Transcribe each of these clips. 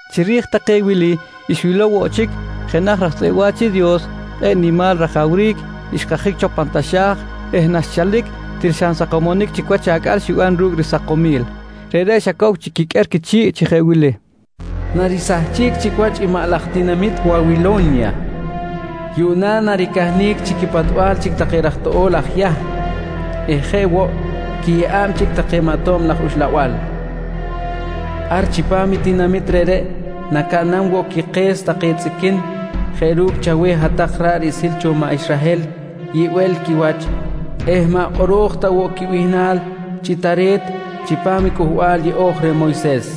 Chiri̱j take wili, xwilow woꞌ chic jenaj raj tzꞌeꞌ wa̱ch i Dios kꞌe̱ꞌ nimal rajawric, xkajic cho pan taxa̱j eh naxchalic til xa nsakomonic chic i wach acꞌal xiban ru̱cꞌ risakomil. Reꞌreꞌ xa cow chic quiqꞌuer quichi̱ꞌ chi jeꞌ wili: «Narisahchic chic wach i maꞌ laj tinamit Wawilo̱nya! Yuꞌna naricahnic chi quipatbal chic take raj toꞌo̱l aj Yahm eh jeꞌ woꞌ quiyeꞌa̱b chic take maꞌ tob laj uxlabal. Ar chipam i tinamit reꞌreꞌ nacaꞌnam woꞌ quike̱s take tzꞌiquin jeꞌ ru̱cꞌ chaweh hat-tak ra̱ꞌ riꞌsil cho maꞌ Israhel yibel quiwach eh maꞌ kꞌoro̱j ta woꞌ quibihnal chi tare̱t chipam Cꞌuhbal Yeꞌo̱j cho reh Moyses.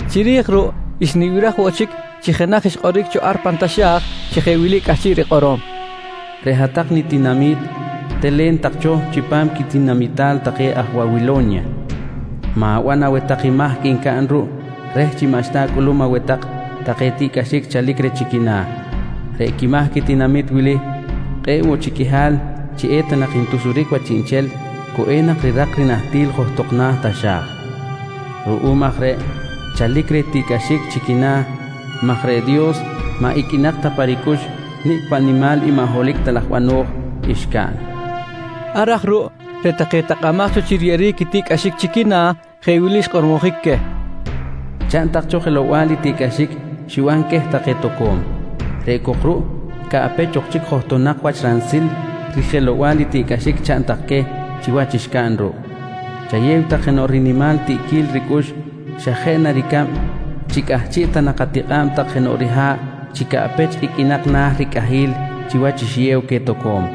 Chiri̱j ruꞌ xnibiraj woꞌ chic chi jenaj xkꞌoric cho ar pan taxa̱j chi jeꞌ wili cꞌahchiꞌ rikꞌorom: «Reꞌ hat-tak nitinami̱t telen tak cho chipam quitinamital take aj Wawilo̱nya. Ma̱ban aweh tak i mahc ncaꞌn ruꞌ reh chi maꞌxta acꞌulum aweh tak take tiꞌcꞌaxic chalic reh chi quina̱. Reꞌ quimahc i tinamit wili kꞌe̱ꞌ woꞌ chic qꞌuihal chi eta nak ntusuric wach chiꞌnchel, cu enak rirak i rinahtil johtok na̱ taxa̱j. Ruꞌum aj reꞌ chalic reh i tiꞌcꞌaxic chi quina̱ maj reꞌ Dios maꞌ iqꞌuinak ta pa ricꞌux nicꞌ paꞌ nimal i maꞌ holohic ta laj bano̱j xcaꞌn, nqui wi̱n. Ar aj ruꞌ reꞌ take takꞌamaj cho chi riyeꞌeric i tiꞌcꞌaxic chi quina̱, jeꞌ wili xkꞌormojic queh: Chaꞌn tak cho jelow-bal i tiꞌcꞌaxic xiban queh take toco̱m. Reꞌ cok ruꞌ caꞌpech ok chic johtonak wach ransil rijelow-bal i tiꞌcꞌaxic chaꞌn tak queh chiwach xcaꞌn ruꞌ. Chayew tak jenoꞌ rinimal ritiꞌquil ricꞌux xa jeꞌ ricab chi cꞌahchiꞌ ta nak atikꞌa̱b tak jenoꞌ riha̱ꞌ chi caꞌpech iqꞌuinak na̱ ricꞌahil chiwach xiyew queh toco̱m.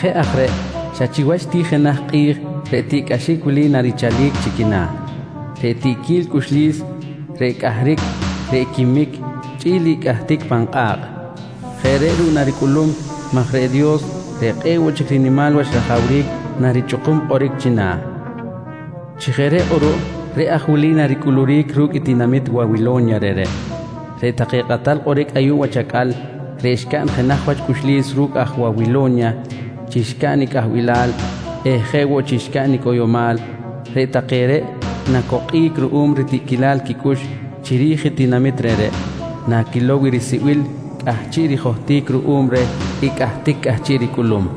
«Chi jeꞌ aj reꞌ xa chiwach ti jenaj kꞌi̱j reꞌ tiꞌcꞌaxic wili narichalic chi quina̱: Reꞌ tiꞌquil cꞌuxlis, reꞌ cꞌahric, reꞌ quimic chꞌi̱l i cꞌahtic pan kꞌa̱kꞌ. Jeꞌ reꞌ ruꞌ naricꞌulum maj reꞌ Dios reꞌ kꞌe̱ꞌ woꞌ chic rinimal wach rajawric narichꞌukum kꞌoric china̱. «Chi jeꞌ reꞌ kꞌuruꞌ, reꞌ aj wili naricꞌuluric ru̱cꞌ i tinamit Wawilo̱nya reꞌreꞌ: Reꞌ take kꞌatal kꞌoric ayuꞌ wach acꞌal reꞌ xcaꞌn jenaj wach cꞌuxlis ru̱cꞌ aj Wawilo̱nya chi xcaꞌn i cꞌahbilal eh jeꞌ woꞌ chi xcaꞌn i cꞌoyomal, reꞌ take reꞌ nacokꞌic ruꞌum ritiꞌquilal quicꞌux chiri̱j i tinamit reꞌreꞌ naquilow i risibil cꞌahchiꞌ rijohtic ruꞌum reh i cꞌahtic cꞌahchiꞌ ricꞌulum.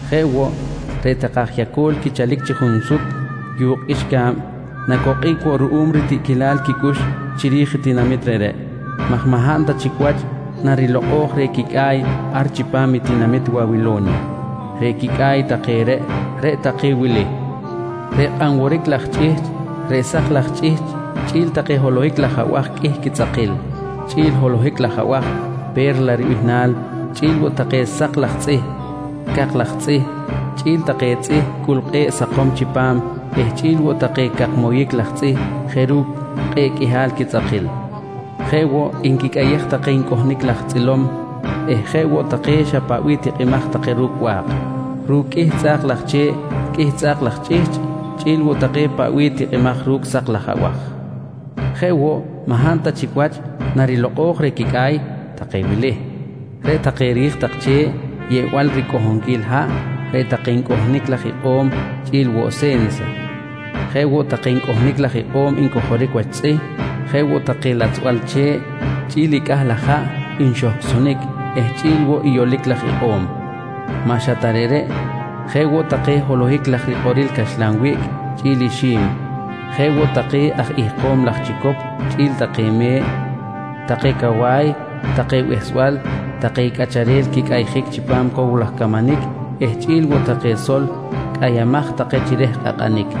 «Jeꞌ woꞌ, reꞌ take aj yaco̱l quichalic chi junsut yu̱kꞌ qꞌuixca̱b nacokꞌic woꞌ ruꞌum ritiꞌquilal quicꞌux chiri̱j tinamit reꞌreꞌ maj maꞌ hab ta chic wach narilokꞌo̱j reh quicꞌa̱y ar chipam i tinamit Wawilo̱nya. Reꞌ quicꞌa̱y take reꞌ, reꞌ take wili: Reꞌ kꞌan woric laj chꞌihchꞌ, reꞌ sak laj chꞌihchꞌ, chꞌi̱l take holohak laj abaj qꞌuih quitzꞌakil, chꞌi̱l i holohic laj abaj “Pe̱rla” ribihnal, chꞌi̱l woꞌ take sak laj tzꞌih, cak laj tzꞌih, chꞌi̱l take tzꞌih cꞌul kꞌe̱ꞌ sakom chipam eh chꞌi̱l woꞌ take cak moyic laj tzꞌih jeꞌ ru̱cꞌ kꞌe̱ꞌ qꞌuihal quitzꞌakil. Jeꞌ woꞌ nquicꞌayej take ncꞌohnic laj tzꞌilom eh jeꞌ woꞌ take xa paꞌ bih tikꞌimaj take ru̱cꞌ ba̱k, ru̱cꞌ qꞌuih tzꞌa̱k laj che̱ꞌ, qꞌuih tzꞌa̱k laj chꞌihchꞌ chꞌi̱l woꞌ take paꞌ bih tikꞌimaj ru̱cꞌ sak laj abaj. «Jeꞌ woꞌ, maꞌ hab ta chic wach narilokꞌo̱j reh quicꞌa̱y take wili: Reꞌ take ri̱j tak che̱ꞌ yeꞌbal ricꞌohonquil haꞌ, reꞌ take ncꞌohnic laj ikꞌo̱m chꞌi̱l woꞌ se̱nsa. Jeꞌ woꞌ take ncꞌohnic laj ikꞌo̱m ncojoric wach tzꞌih, jeꞌ woꞌ take latzbal che̱ꞌ chꞌi̱l i cꞌah laj haꞌ nxohcꞌsonic eh chꞌi̱l woꞌ i yolic laj ikꞌo̱m. Maꞌ xa ta reꞌreꞌ, jeꞌ woꞌ take holohic laj rikꞌoril caxlan wiꞌc chꞌi̱l ixi̱m, jeꞌ woꞌ take aj ihkom laj chicop chꞌi̱l take me̱ꞌ, take cawa̱y, take behsbal, take cꞌacharel quicꞌayjic chipam cow laj camanic eh chꞌi̱l woꞌ take sol cꞌayamaj take chi reh kꞌakꞌanic.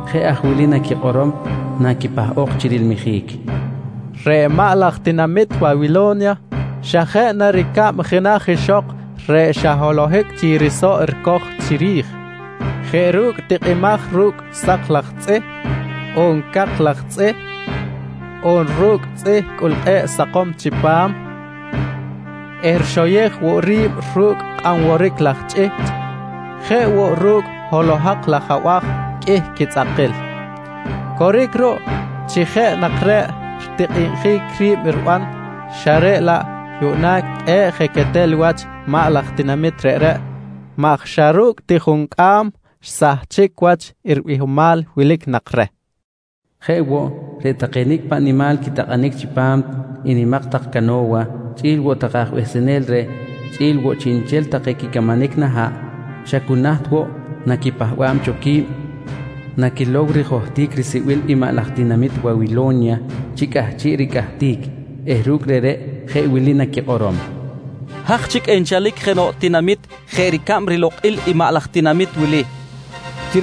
Jeꞌ aj wili naquikꞌorom naquipahꞌok chi rilmijic: ‹Reꞌ maꞌ laj tinamit Wawilo̱nya xa jeꞌ na ricab jenaj ixok reꞌ xa holohic chic risoꞌ ricoj chiri̱j jeꞌ ru̱cꞌ tikꞌimaj ru̱cꞌ sak laj tzꞌih, on cak laj tzꞌih, on ru̱cꞌ tzꞌih cꞌul kꞌe̱ꞌ sakom chipam eh rixoyej woꞌ ri̱b ru̱cꞌ kꞌan woric laj chꞌihchꞌ, jeꞌ woꞌ reꞌ ru̱cꞌ holohak laj abaj qꞌuih quitzꞌakil. Coric ruꞌ chi je nak reꞌ ritikꞌinjic ri̱b riban, xa reꞌ laꞌ yuꞌna kꞌe̱ꞌ je quetal wach i maꞌ laj tinamit reꞌreꞌ maj xa ru̱cꞌ ti juncꞌam xsahchic wach i ribihomal nak wilic reh, nqui naquikꞌorom. «Jeꞌ woꞌ, reꞌ take nicꞌ paꞌ nimal quitakꞌanic chipam i nimak tak cano̱wa chꞌi̱l woꞌ take aj behsenel reh, chꞌi̱l woꞌ chiꞌnchel take quicamanic na̱ haꞌ xa cu naht woꞌ naquipahba̱b cho qui̱b naquilow rijohtic risibil i maꞌ laj tinamit Wawilo̱nya chi cꞌahchiꞌ ricꞌahtic eh ru̱cꞌ reꞌreꞌ jeꞌ wili naquikꞌorom: ‹Haj chic enchalic jenoꞌ tinamit jeꞌ ricab rilokꞌil i maꞌ laj tinamit wili, nqui naquikꞌorom.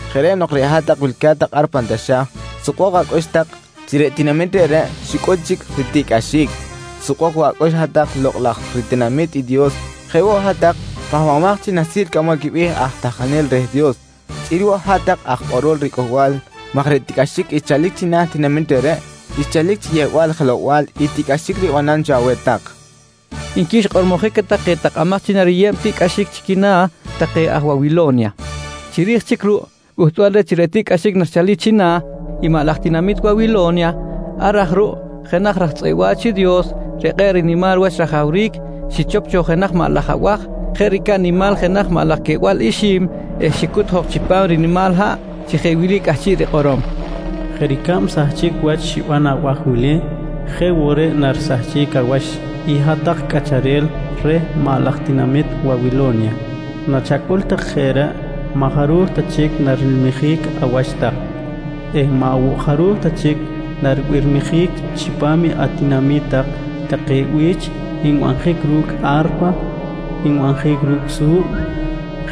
«Jeꞌ reꞌ nok reꞌ hat-tak wilca̱t tak ar pan taxa̱j sukbok acꞌux tak chi reꞌ tinamit reꞌreꞌ xicꞌul chic ritiꞌcꞌaxic. Sukbok woꞌ acꞌux hat-tak lokꞌ laj ritinami̱t i Dios, jeꞌ woꞌ hat-tak pahbamaj chi nahsil cꞌamol quibe̱h aj tahkanel reh Dios, chꞌi̱l woꞌ hat-tak aj kꞌorol riCꞌuhbal maj reꞌ tiꞌcꞌaxic xchalic china̱ tinamit reꞌreꞌ xchalic chi yeꞌbal jelow-bal i tiꞌcꞌaxic ribanam cho aweh tak, nqui xkꞌormojic queh take takꞌamaj chi nariyeb i tiꞌcꞌaxic chi quina̱ take aj Wawilo̱nya. Chiri̱j chic ruꞌ, cꞌuhtbal reh chi reꞌ tiꞌcꞌaxic narichalic china̱ i maꞌ laj tinamit Wawilo̱nya, ar aj ruꞌ jenaj raj tzꞌeꞌ wa̱ch i Dios reꞌ kꞌe̱ꞌ nimal wach rajawric xichop cho jenaj maꞌ laj abaj jeꞌ ricab nimal jenaj maꞌ laj queꞌbal ixi̱m eh xicut jok chipam rinimal haꞌ chi jeꞌ wili cꞌahchiꞌ rikꞌorom: «Jeꞌ ricab sahchic wach xiban abaj wili jeꞌ woꞌ reꞌ narisahchic awach i hat-tak cꞌacharel reh maꞌ laj tinamit Wawilo̱nya. Nachacꞌul tak jeꞌ reꞌ, maꞌ jaruj ta chic narilmijic awach tak eh maꞌ woꞌ jaruj ta chic naribirmijic chipam atinami̱t tak take bi̱ch nbanjic ru̱cꞌ a̱rpa, nbanjic ru̱cꞌ su̱b,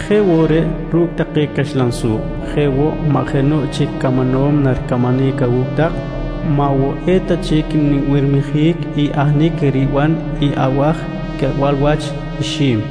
jeꞌ woꞌ reꞌ ru̱cꞌ take caxlan su̱b. Jeꞌ woꞌ, maꞌ jenoꞌ chic camanom naricamanic awu̱cꞌ tak eh maꞌ woꞌ eta chic nbirmijic i ahnic riban i abaj queꞌbal wach ixi̱m.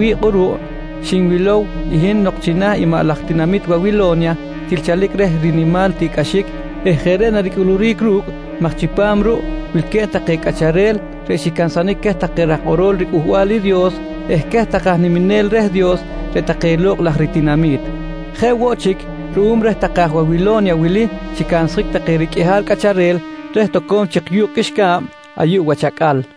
Jeꞌ aj reꞌ riwi̱ꞌ kꞌuruꞌ, xinwilow i hin nok china̱ i maꞌ laj tinamit Wawilo̱nya til chalic reh i rinimal tiꞌcꞌaxic eh jeꞌ reꞌ naricꞌuluric ru̱cꞌ maj chipam ruꞌ wilque̱b take cꞌacharel reꞌ xicansanic queh take aj kꞌorol riCꞌuhbal i Dios eh queh take aj niminel reh Dios reꞌ take lokꞌ laj ritinami̱t. Jeꞌ woꞌ chic ruꞌum reh take aj Wawilo̱nya wili xicansjic take riqꞌuihal cꞌacharel reh toco̱m chik yu̱kꞌ qꞌuixca̱b ayuꞌ wach acꞌal.